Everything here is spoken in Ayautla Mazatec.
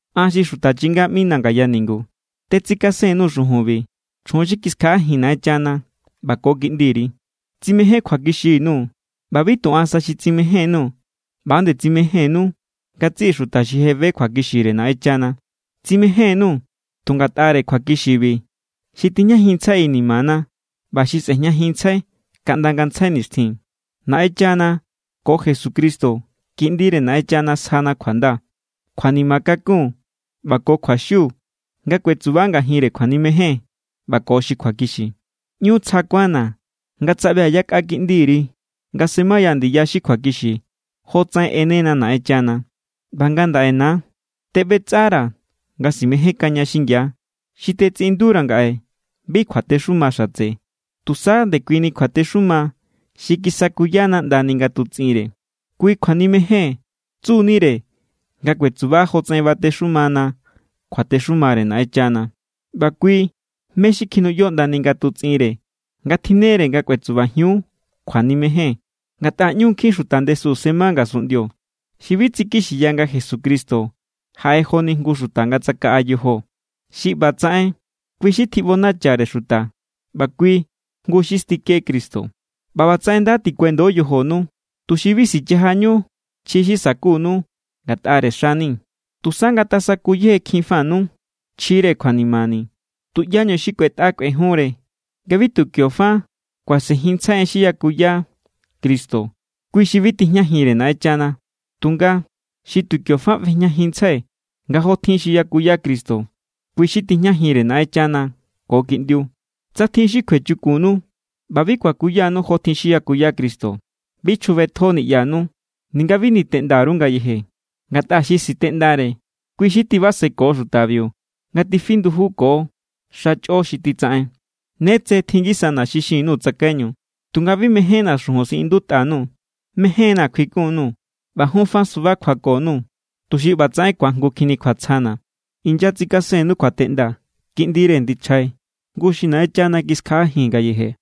An, xi xuta chinga ꞌmina̱ ngaya ningu, tetsikasen_nuu̱ xujunbi chjun xi kiskjaꞌajin Naꞌenchana ꞌba ko kiꞌndiri. Tsimején kjuakixi_nuu̱. ꞌBa bi tu an sa xi tsimejénnu, ꞌba=nde tsimejénnu ngatsiꞌi xuta xi je be kjuakixire Naꞌenchana. Tsimején_nuu̱ tu ngatꞌare kjuakixibi xi tijñajinntsjai inimana ꞌba xi sꞌe̱jñajinntsjai kaꞌnda ngantsjai nixtjin. Naꞌenchana ko Jesucristo, Kiꞌndire Naꞌenchana, sjana kjuanda, kjuanima kakun ꞌba ko kjuaxiu nga kuetsuba ngajin kjuanimejen ꞌba ko xi kjuakixi. ꞌÑu tsja kuánna̱ nga tsaꞌbia̱ yakꞌa kiꞌndiri nga semaya ndiya xi kjuakixi, jotsaꞌen ꞌenena Naꞌenchana. ꞌBa ngandaꞌe, na, teꞌbetsꞌara̱ nga simejénkaña xingia. Xi tetsiꞌindura̱ ngaꞌe bi kjuatexuma xatse, tusa ndekuini kjuatexuma xi kisakuyana ꞌndani ngatutsꞌinre. Kui kjuanimejen tsu=nire nga kuetsuba jotsaꞌen batexuma kjuatexumare Naꞌenchana. ꞌBa kui mé= xi kjinuꞌyo ꞌndani ngatutsꞌinre, nga tjinnere nga kuetsubajiun kjuanimejen. Ngatꞌa ꞌñu nkjin xuta ndesu sema ngasunꞌndio xi bi tsikixiya nga Jesucristo jaꞌe joni jngu xuta nga tsakaꞌa yojo. Xi ꞌba tsaꞌen, kui xi tjiꞌbonachare xuta ꞌba kui jngu xi stike Cristo. ꞌBa ꞌbatsaꞌen nda tikuendo yojonu, tuxi bi sichajañu chji xi sa̱kunu ngatꞌare xani̱. Tusa ngatasaku yejekjinfanu chjire kjuanimani̱. Tuꞌyañu xi kꞌuetꞌa kꞌuejunre nga bi tu kio fa kuasenjinntsjai en xi yakuya Cristo, kui xi bi tijñajinre Naꞌenchana. Tunga xi tu kio fa ꞌbejñajinntsjai nga jotjin xi yakuya Cristo, kui xi tijñajinre Naꞌenchana ko Kiꞌndiu. Tsa tjin xi kjuechukunnu ꞌba bi kuakuyanu jotjin xi yakuya Cristo, bi chjubetjo niꞌyanu ninga bi niteꞌnda_ru ngayeje. Ngatꞌa xi siteꞌndare, kui xi tibaseko xutabiu nga tifi ndujuko xa chꞌo xi titsaꞌen. Ne tse tjin ngisana xi xin_nuu̱ tsakaiñu, tunga bi mejénna̱ xujun siꞌindutꞌa_nuu̱. Mején=na̱ kjuikun_nuu̱ ꞌba jun fa suba kjuako_nuu̱, tuxi ꞌbatsaꞌen ku̱ajngukjinni kjuatsjana. Inyatsikasennu kjuateꞌnda kiꞌndire ndichjai, jngu xi Naꞌenchana kiskjaꞌajin ngayeje.